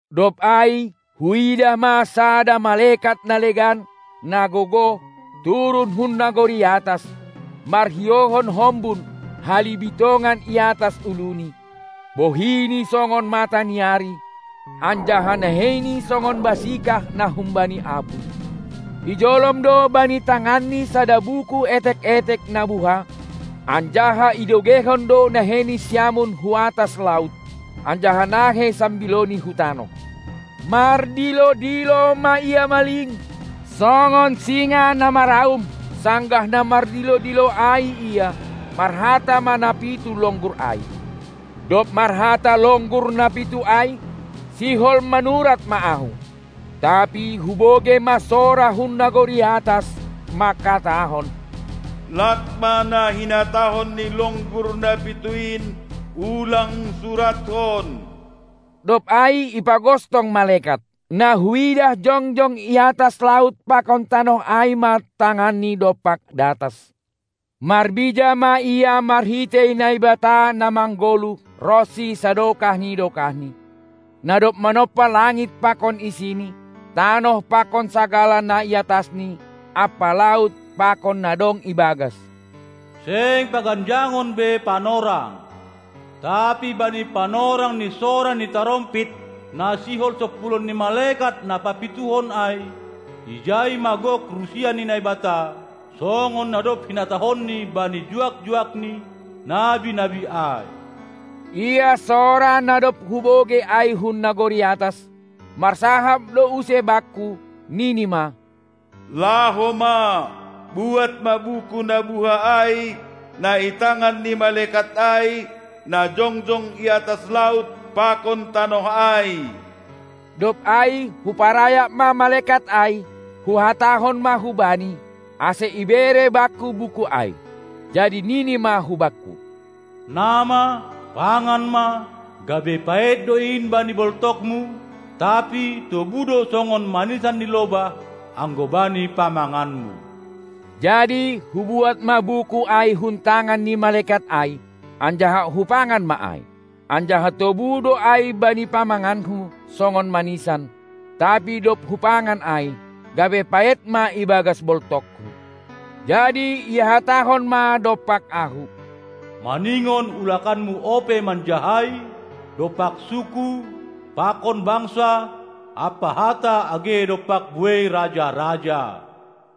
Dob ai huidah ma sada malekat na legan, na gogoh, turun hun nagori atas, marhiouhon hombun, halibitongan i atas uluni, bohini songon mataniari anjaha naheini songon basikah na humbani apuy. Ijolom do bani tanganni sada buku etek-etek na buha. Anjaha idogeihon do naheini siamun hu atas laut, anjaha nahei sambilouni hu tanoh. Mardilo-dilo ma ia maling, songon singa na maraum; sanggah na mardilo-dilo ai ia, marhata ma na pitu longgur ai. Dob marhata longgur na pitu ai, sihol manurat ma ahu; tapi hubogei ma sora hun nagori atas manghatahon: Lak ma na hinatahon ni longgur na pitu in, ulang surathon! Dob ai ipagostong malekat, na huidah jongjong i atas laut pakon tanoh ai ma tanganni dompak datas. Marbija ma ia marhitei Naibata na manggoluh ronsi sadokah ni dokahni, na dob manompa langit pakon isini, tanoh pakon sagala na i atasni ampa laut pakon na dong ibagas: Seng paganjangon be panorang, tapi bani panorang ni sora ni tarompit na sihol sompulon ni malekat na papituhon ai, ijai ma gok rusia ni Naibata, songon na dob hinatahonNi bani juak-juakNi, nabi-nabi ai. Ia sora na dob hubogei ai hun nagori atas, marsahap do use bakku, nini ma: Laho ma, buat ma buku na buha ai, na i tangan ni malekat ai, na jongjong i atas laut pakon tanoh ai. Dob ai huparayak ma malekat ai, huhatahon ma hubani, ase ibere bakku buku ai. Jadi nini ma hubakku: Na ma, pangan ma, gabe paet do in bani boltokmu, tapi tobu do songon manisan ni lobah anggo bani pamanganmu. Jadi hubuat ma buku ai hun tangan ni malekat ai anjaha hupangan ma ai; anjaha tobu do ai bani pamanganku songon manisan, tapi dob hupangan ai, gabe paet ma ibagas boltokhu. Jadi ihatahon ma dompak ahu: Maningon ulakanmu ope manjahai dompak suku pakon bangsa ampa hata age dompak buei raja-raja.